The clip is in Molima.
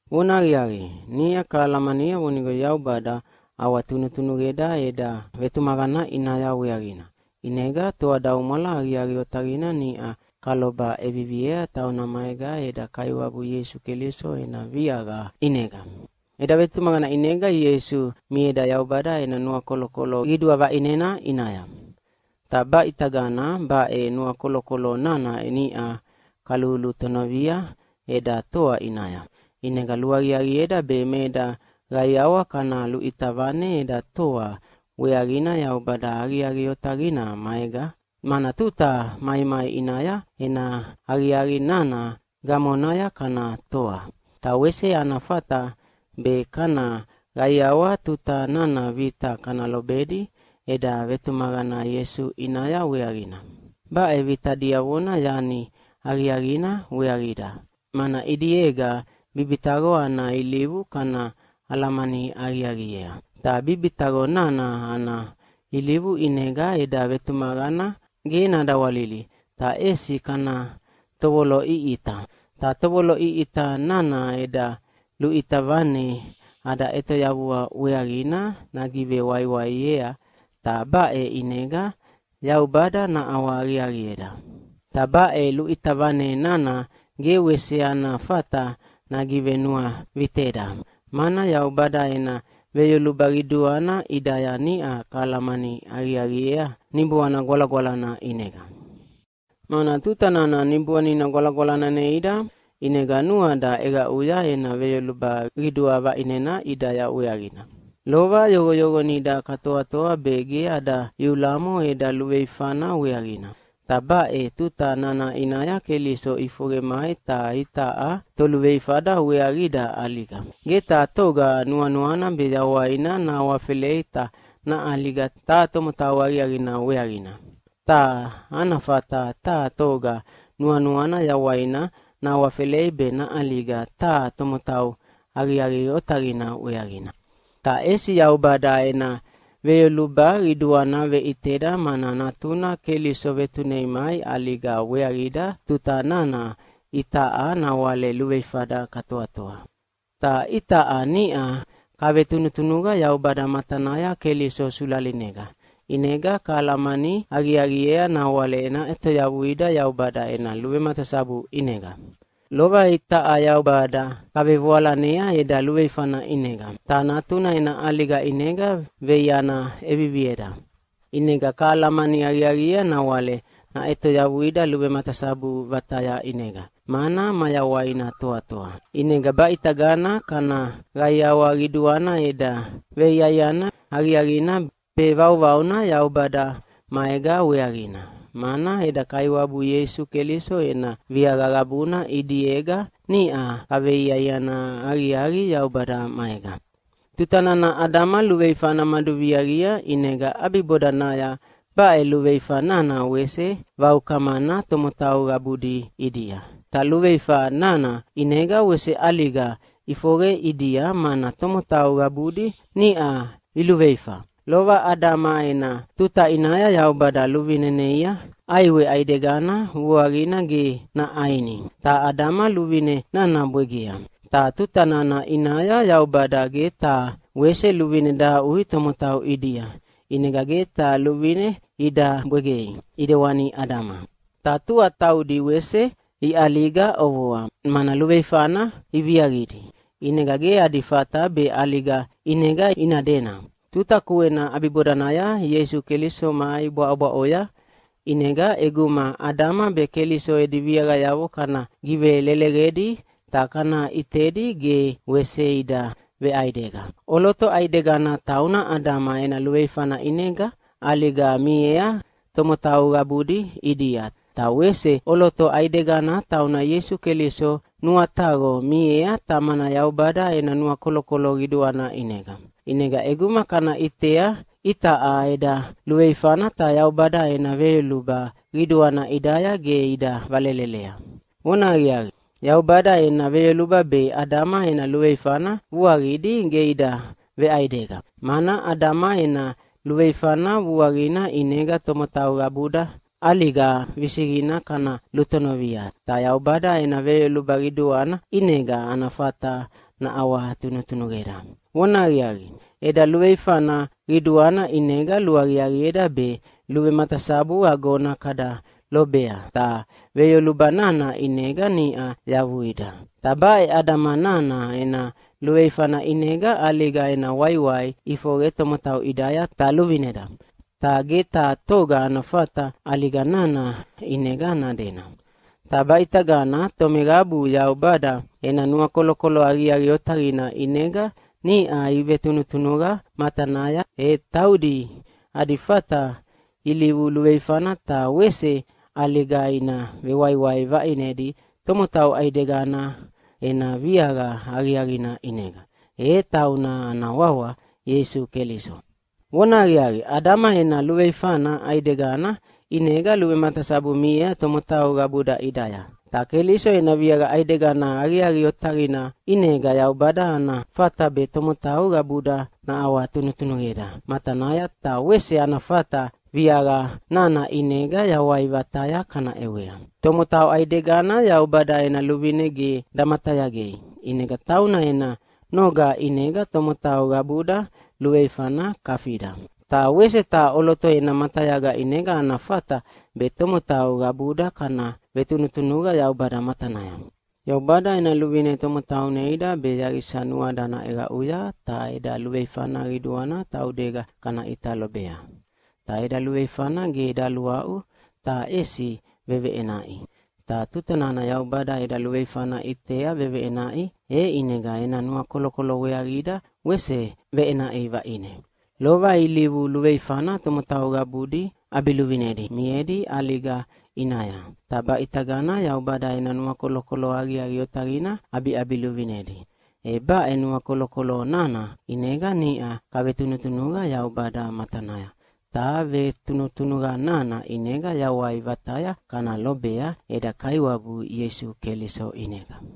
Vonahaqiaqi, niʼa kahalamania vonigo Yaubada ʼawatunutunuqeda eda vetumaqana ʼinaya weaqina, ʼinega toadaumwala aqiaqi otaqina niʼa kaloba ʼeviviea tauna maega eda Kaiwabu Ieisu Keliso ena viaqa ʼinega. Eda vetumaqana ʼinega Ieisu mieda Yaubada ena nuakolokolo qidua vaʼinena ʼinaya. Ta baʼitagana baʼe nuakolokolo nana niʼa kalulutonovia eda toa ʼinaya. ʼInega luaqiaqieda be me eda qaiawa kana luʼita vane eda toa weaqina Yaubada aqiaqi otaqina maega, mana tuta maimai ʼinaya ena aqiaqi nana gamonaya kana toa. Ta wese ana fata be kana qaiawa tuta nana vita kana lobedi eda vetumaqana Ieisu ʼinaya weaqina. Baʼe vita diavona yani aqiaqina weaqida, mana ʼidiega bibitaqo ana ilivu kana alamani aqiaqiea. Ta bibitaqo nana ana ilivu ʼinega eda vetumaqana ge nadawalili ta ʼesi kana tovoloʼiʼita. Ta tovoloʼiʼita nana eda luʼita vane ada ʼetoyavua weaqina nagivewaiwaiea, ta baʼe ʼinega Yaubada naʼawahaqiaqieda. Ta baʼe luʼita vane nana ge wese ana fata nagivenuaviteda, mana Yaubada ena veyoluba qiduana ʼidaya niʼa kahalamani aqiaqiea Niboana Gwalagwalana ʼinega. Mana tuta nana Niboanina Gwalagwalana neida ʼinega nuada ʼeqaʼuya ena veyoluba qidua vaʼinena ʼidaya weaqina. Lova yoqoyoqonida katoatoa be ge ada iulamo eda luveifana weaqina. Ta baʼe tuta nana ʼinaya Keliso ʼifoqe mai ta itaʼa toluveifada weaqida ʼaliga. Ge taha toga nuanuana be yawaina nahawafelei ta naʼaliga taha tomotau aqiaqina weaqina. Ta ana fata taha toga nuanuana yawaina nahawafelei be naʼaliga taha tomotau aqiaqi otaqina weaqina. Ta ʼesi Yaubada ena veyoluba qiduana veʼiteda mana Natuna Keliso vetunei mai ʼaliga weaqida tuta nana itaʼa nawale luveifada katoatoa. Ta itaʼa niʼa kavetunutunuqa Yaubada matanaya Keliso sulalinega, ʼinega kahalamani aqiaqiea nawale naʼetoyavuida Yaubada ena luvematasabu ʼinega! Lova itaʼa Yaubada kavevoalanea eda luveifana ʼinega. Ta Natuna ena ʼaliga ʼinega veiana ʼevivieda. ʼInega kahalamani aqiaqiea nawale naʼetoyavuida luvematasabu vataya ʼinega, mana mayawaina toatoa. ʼInega baʼitagana kana qaiawa qiduana eda veiaiana aqiaqina be vauvauna Yaubada maega weaqina, mana eda Kaiwabu Ieisu Keliso ena viaqa qabuna ʼidiega niʼa kaveiaiana aqiaqi Yaubada maega. Tuta nana Adama luveifana maduviaqia, ʼinega ʼabibodanaya baʼe luveifa nana wese vaukamana tomotau qabudi ʼidia. Ta luveifa nana ʼinega wese ʼaliga ʼifoqe ʼidia, mana tomotau qabudi niʼa iluveifa. Lova Adama ena tuta ʼinaya Yaubada luvine neia ʼaiwe ʼaidegana vuaqina ge naʼaini, ta Adama luvine nana bwegea. Ta tuta nana ʼinaya Yaubada ge taha wese luvine dahaʼui tomotau ʼidia, ʼinega ge taha luvine ida bwegei ʼidewani Adama. Ta tua taudi wese iʼaliga ʼovoa, mana luveifana iviaqidi, ʼinega ge adi fata be ʼaliga ʼinega ina dena. Tuta kuena ʼabibodanaya Ieisu Keliso mai bwaʼobwaʼoya, ʼinega ʼeguma Adama be Keliso edi viaqayavo kana giveleleqedi ta kana ʼitedi ge wese ida veʼaidega. ʼOloto ʼaidegana tauna Adama ena luveifana ʼinega ʼaliga miea tomotau qabudi ʼidia, ta wese ʼoloto ʼaidegana tauna Ieisu Keliso nuataqo miea Tamana Yaubada ena nuakolokolo qiduana ʼinega. ʼInega ʼeguma kana ʼitea itaʼa eda luveifana ta Yaubada ena veyoluba qiduana ʼidaya ge ida velelelea. Vonahaqiaqi, Yaubada ena veyoluba be Adama ena luveifana vuaqidi ge ida veʼaidega. Mana Adama ena luveifana vuaqina ʼinega tomotau qabuda ʼaliga visiqina kana lutonovia, ta Yaubada ena veyoluba qiduana ʼinega ana fata naʼawatunutunuqeda. Vonahaqiaqi, eda luveifana qiduana ʼinega luaqiaqieda be luvematasabu agona kada lobea, ta veyoluba nana ʼinega niʼa yavuida. Ta baʼe Adama nana ena luveifana ʼinega ʼaliga ena waiwai ʼifoqe tomotau ʼidaya ta luvineda, ta ge taha toga ana fata ʼaliga nana ʼinega nadena. Ta baʼitagana tomeqabu Yaubada ena nuakolokolo aqiaqi otaqina ʼinega niʼa ivetunutunuqa matanaya, e taudi adi fata ilivu luveifana ta wese ʼaliga ina vewaiwai vaʼinedi tomotau ʼaidegana ena viaqa aqiaqina ʼinega, e tauna ana wawa Ieisu Keliso. Vonahaqiaqi, Adama ena luveifana ʼaidegana ʼinega luvematasabu miea tomotau qabuda ʼidaya, ta Keliso ena viaqa ʼaidegana aqiaqi otaqina ʼinega Yaubada ana fata be tomotau qabuda naʼawatunutunuqeda matanaya, ta wese ana fata viaqa nana ʼinega yawai vataya kana ʼewea. Tomotau ʼaidegana Yaubada ena luvine ge damatayagei ʼinega tauna ena noga ʼinega tomotau qabuda luveifana kafida. Ta wese taha ʼoloto ena matayaga ʼinega ana fata be tomotau qabuda kana vetunutunuqa Yaubada matanaya. Yaubada ena luvine tomotau neida be yaqisa nuada naʼeqaʼuya ta eda luveifana qiduana taudega kana ʼita lobea. Ta eda luveifana ge daluaʼu, ta ʼesi veveʼenaʼi. Ta tuta nana Yaubada eda luveifana ʼitea veveʼenaʼi, e ʼinega ena nuakolokolo weaqida wese veʼenaʼi vaʼine. Lova ilivu luveifana tomotau qabudi ʼabiluvinedi miedi ʼaliga ʼinaya, ta baʼitagana Yaubada ena nuakolokolo aqiaqi otaqina ʼabiʼabiluvinedi. E baʼe nuakolokolo nana ʼinega niʼa kavetunutunuqa Yaubada matanaya, ta vetunutunuqa nana ʼinega yawai vataya kana lobea eda Kaiwabu Ieisu Keliso ʼinega.